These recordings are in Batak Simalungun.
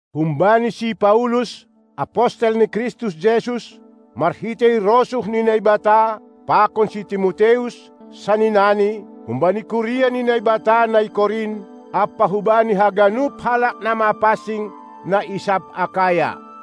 Humbani si Paulus, apostel ni Kristus Jesus, marhitei rosuh ni Naibata, pakon si Timoteus, sanina ni, humbani kuria ni Naibata, na i Korint, ampa hubani haganup halak na mapansing, na i sab Akaya.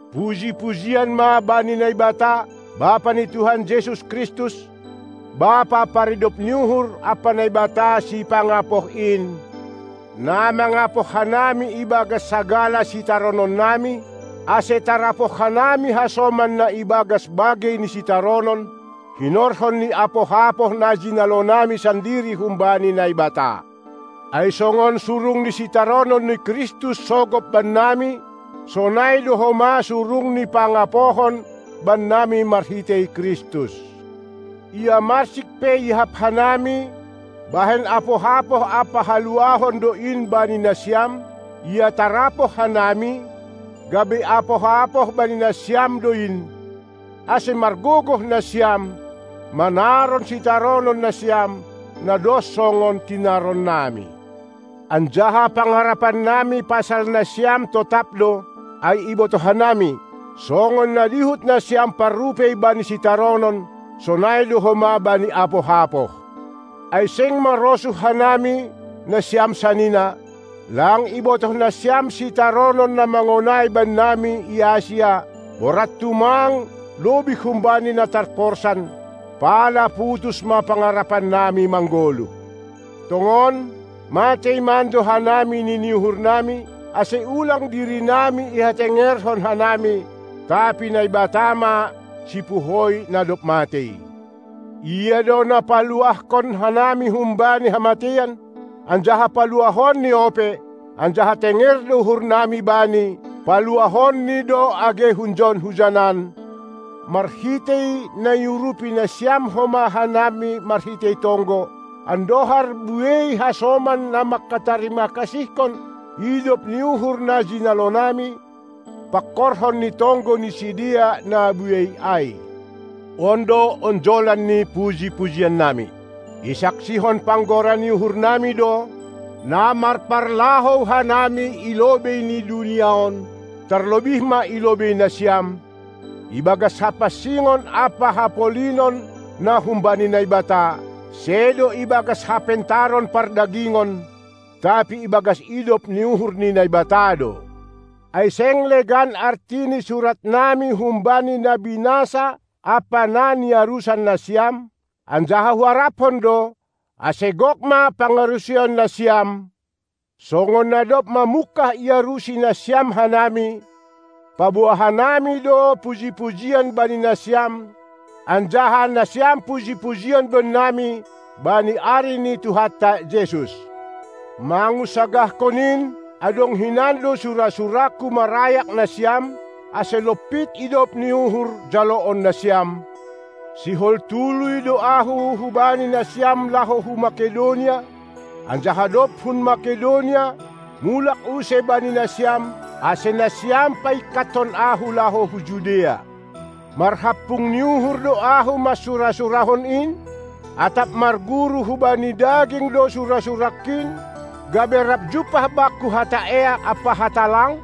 Puji-pujian ma bani Naibata, Bapa ni Tuhan Jesus Kristus, Bapa paridop ni uhur ampa Naibata sipangapoh in, na mangapoh hanami ibagas sagala sitarononnami, ase tarapoh hanami hasoman na ibagas bagei ni sitaronon, hinorhon ni apoh-apoh na jinalonami sandiri humbani Naibata. Ai songon surung ni sitaronon ni Kristus sogop bannami, sonai do homa surung ni pangapohon bannami marhitei Kristus. Ia marsik pe iahap hanami, bahen apoh-apoh ampa huluahon do in bani nasiam; ia tarapoh hanami, gabe apoh-apoh bani nasiam do in, ase margogoh nasiam manaron sitaronon nasiam, na dos songon tinaronnami. Anjaha pangarapannami pasal nasiam totap do, ai ibotoh hanami: Songon na dihut nasiam parrupei bani sitaronon, sonai do homa bani apoh-apoh. Ai seng marosuh hanami, nasiam sanina, lang ibotoh nasiam sitaronon na mangonai bannami i Asia borat tumang, lobih humbani na tarporsan, pala putus ma pangarapannami manggoluh. Tongon, matei mando hanami nini uhurnami, ase ulang dirinami ihatengerhon hanami, tapi Naibata ma, sipuhoi na dob matei. Ia do na paluahkon hanami humbani hamateian, anjaha paluahonni ope, anjaha tenger do uhurnami Bani, paluahonni do age hunjon-hunjanan, marhitei na iurupi nasiam homa hanami marhitei tonggo, andohar buei hasoman na manghatarima-kasihkon idop ni uhur na jinalonami, pangkorhon ni tonggo ni sidea na buei ai. On do onjolan ni puji-pujiannami: Isaksihon panggora ni uhurnami do, na marparlahou hanami i lobei ni dunia on, tarlobih ma i lobei nasiam, ibagas hapansingon ampa hapolinon na humbani Naibata, sedo ibagas hapentaron pardagingon, tapi ibagas idop ni uhur ni Naibata do. Ai seng legan arti ni suratnami humbani na binasa ampa na niarusan nasiam. Anjaha huarapkon do, ase gok ma pangarusion nasiam, songon na dob mamungkah iarusi nasiam hanami, paboa hanami do puji-pujian bani nasiam anjaha nasiam puji-pujian bannami bani ari ni Tuhanta Jesus. Mangunsagahkon in, adong hinan do sura-surangku marayak nasiam, ase lompit idop ni uhur jaloon nasiam, Sihol tuluy do ahu hubani nasiam laho hu Makedonia, anjaha dob hun Makedonia, mulak use bani nasiam, ase nasiam paingkathon ahu laho hu Judea. Marhampung ni uhur do ahu mansura-surahon in? Atap marguru hubani daging do sura-surangkin, gabe rap jumpah bakku hata eak ampa hata lang?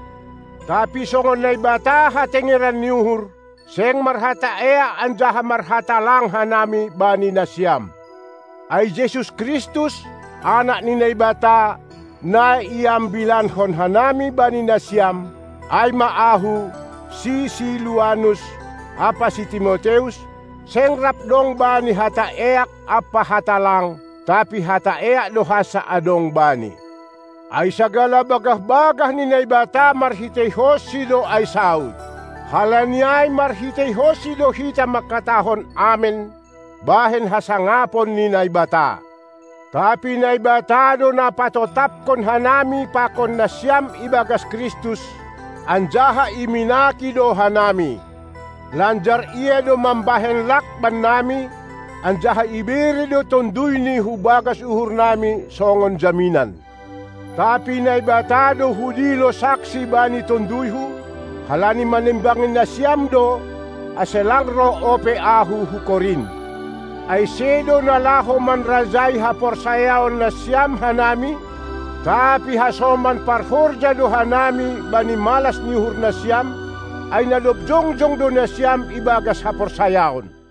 Tapi songon Naibata hatengeran ni uhur, seng marhata eak anjaha marhata lang hanami bani nasiam. Ai Jesus Kristus, Anak ni Naibata, na iambilankon hanami bani nasiam, ai ma ahu, si Siluanus ampa si Timoteus, seng rap dong Bani hata eak ampa hata lang, tapi hata eak do hansa adong Bani. Ai sagala bagah-bagah ni Naibata marhiteihonSi do ai saud. Halani ai marhiteihonSi do hita mangkatahon Amen, bahen hasangapon ni Naibata. Tapi Naibata do na patotapkon hanami pakon nasiam ibagas Kristus, anjaha iminaki do hanami. Lanjar Ia do mambahen lak bannami, anjaha ibere do TonduyNi hubagas uhurnami songon jaminan. Tapi Naibata do hudilo saksi bani tonduyhu, halani manimbangi nasiam do, ase lang roh ope ahu hu Korint. Ai sedo na laho manrajai haporsayaon nasiam hanami, tapi hasoman parhorja do hanami bani malas ni uhur nasiam, ai na dob jongjong do nasiam ibagas haporsayaon.